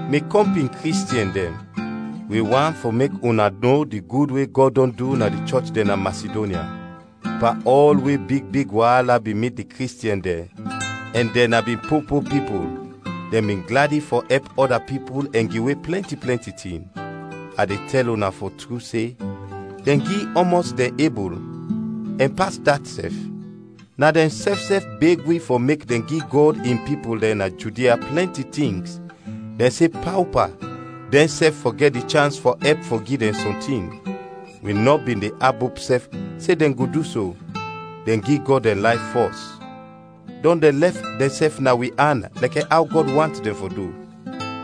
Mi kɔmpin Kristiɛn dɛn, wi want fɔ mek una no di gud we Gɔd dɔn du na di chɔch dɛn na Masidonya. Pan ɔl we big big waala bin mit di Kristiɛn dɛn ɛn dɛn na bin po po pipul, dɛn bin gladi fɔ ɛp ɔda pipul ɛn giwe plɛnti plɛnti tin. A de tɛl una fɔ tru se, dɛn gi ɔmɔs dɛn ebul, ɛn pas dat sɛf. Na dɛnsɛf sɛf beg wi fɔ mek dɛn gi Gɔd in pipul dɛn na Judia plɛnti tings, dɛn se paopa dɛnsɛf fɔ gɛt di chans fɔ ɛp fɔ gi dɛn sɔntin. Wi nɔ bin de abop sɛf se dɛn go du so; dɛn gi Gɔd dɛn layf fɔs, dɔn dɛn lɛf dɛnsɛf na wi an lɛkɛ aw Gɔd want dɛn fɔ du.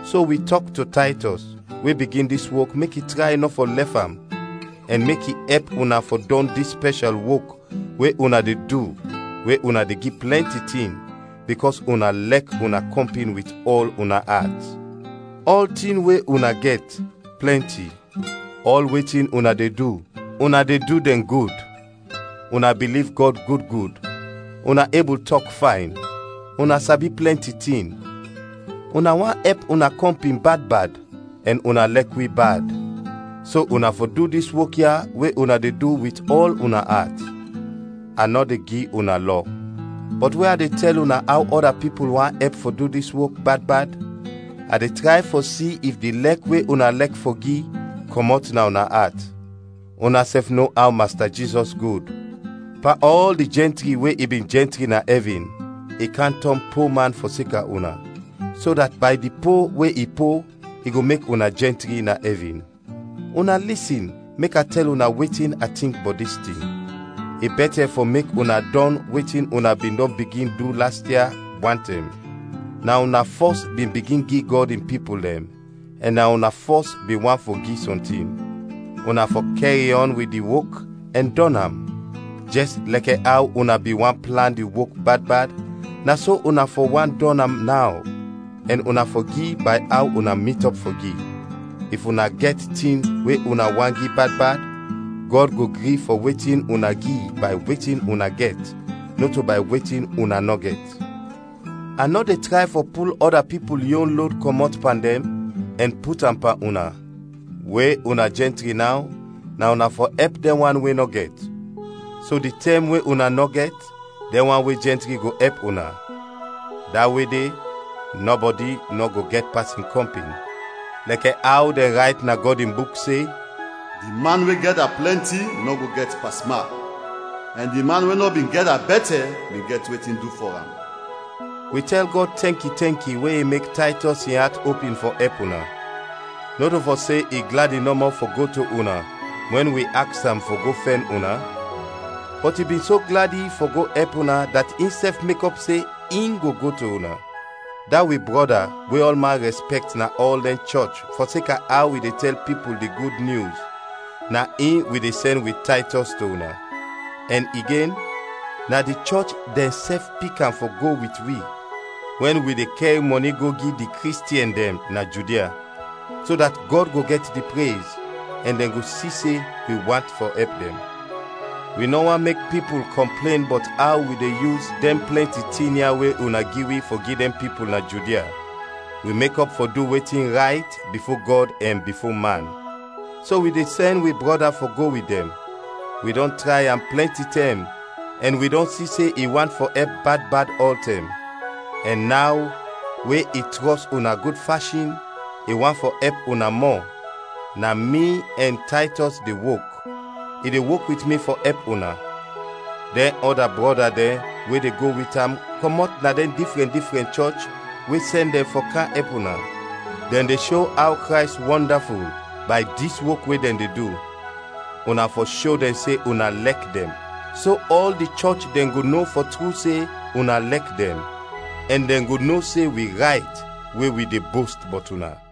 So wi tɔk to Taytɔs, we bigin dis wok mek i tray nɔ fɔ lɛf am ɛn mek i ɛp una fɔ dɔn dis spɛshal wok we una de du we una de gi plɛnti tin, bikɔs una lɛk una kɔmpin wit ɔl una at. Ɔltin we una gɛt, plɛnti; ɔl wetin una de du, una de du dɛn gud: una biliv Gɔd gud gud, una ebul tɔk fayn, una sabi plɛnti tin, una want ɛp una kɔmpin bad bad, ɛn una lɛk wi bad. So una fɔ du dis wok ya we una de du wit ɔl una at. A nɔ de gi una lɔ. Bɔt we a de tɛl una aw ɔda pipul want ɛp fɔ du dis wok bad bad, a de tray fɔ si if di lɛk we una lɛk fɔ gi, kɔmɔt na una at. Unasɛf no aw Masta Jizɔs gud; pan ɔl di jɛntri we i bin jɛntri na ɛvin, i kam tɔn po man fɔseka una, so dat bay di po we i po i go mek una jɛntri na ɛvin. Una lisin mek a tɛl una wetin a tink bɔt dis tin: i bɛtɛ fɔ mek una dɔn wetin una bin dɔn bigin du las ia, wantɛm. Na una fɔs bin bigin gi Gɔd in pipul dɛn, ɛn na una fɔs bin want fɔ gi sɔntin. Una fɔ kɛriɔn wit di wok ɛn dɔn am! Jɛs lɛkɛ aw una bin want plan di wok bad bad, na so una fɔ want dɔn am naw, ɛn una fɔ gi bay aw una mitɔp fɔ gi. If una gɛt tin we una want gi bad bad, Gɔd go gri fɔ wetin una gi bay wetin una gɛt, nɔto bay wetin una nɔ gɛt. A nɔ de tray fɔ pul ɔda pipul yon lod kɔmɔt pan dɛn ɛn put am pan una; we una jɛntri naw, na una fɔ ɛp dɛn wan we nɔ gɛt. So di tɛm we una nɔ gɛt, dɛn wan we jɛntri go ɛp una. Da we de, nɔbɔdi nɔ go gɛt pas in kɔmpin. Lɛkɛ aw dɛn rayt na Gɔd in Buk se, “Di man we gɛda plɛnti nɔ go gɛt pasmak, ɛn di man we nɔ bin gɛda bɛtɛ bin gɛt wetin du fɔ am.” Wi tɛl Gɔd tɛnki, tɛnki we i mek Taytɔs in at opin fɔ ɛp una! Nɔto fɔ se i gladi nɔmɔ fɔ go to una wɛn wi aks am fɔ go fɛn una; bɔt i bin so gladi fɔ go ɛp una dat insɛf mekɔp se in go go to una. Da wi brɔda we ɔlman rɛspɛkt na ɔl dɛn chɔch fɔseka aw i de tɛl pipul di Gud Nyus, na in wi de sɛn wit Taytɔs to una. Ɛn igen, na di chɔch dɛnsɛf pik am fɔ go wit wi wɛn wi de kɛr mɔni go gi di Kristiɛn dɛn na Judia, so dat Gɔd go gɛt di prez, ɛn dɛn go si se wi want fɔ ɛp dɛn. Wi nɔ want mek pipul kɔmplen bɔt aw wi de yus dɛn plɛnti tin ya we una gi wi fɔ gi dɛn pipul na Judia. Wi mekɔp fɔ du wetin rayt, bifo Gɔd ɛn bifo man. So wi de sɛn wi brɔda fɔ go wit dɛn; wi dɔn tray am plɛnti tɛm ɛn wi dɔn si se i want fɔ ɛp bad bad ɔltɛm. Ɛn naw we i trɔs una gud fashin, i want fɔ ɛp una mɔ. Na mi ɛn Taytɔs de wok, i de wok wit mi fɔ ɛp una; dɛn ɔda brɔda dɛn we de go wit am kɔmɔt na dɛn difrɛn difrɛn chɔch we sɛn dɛn fɔ kam ɛp una. Dɛn de sho aw Krays wɔndaful, bay dis wok we dɛn de du. Una fɔ sho dɛn se una lɛk dɛn, so ɔl di chɔch dɛn go no fɔ tru se una lɛk dɛn, ɛn dɛn go no se wi rayt we wi de bost bɔt una.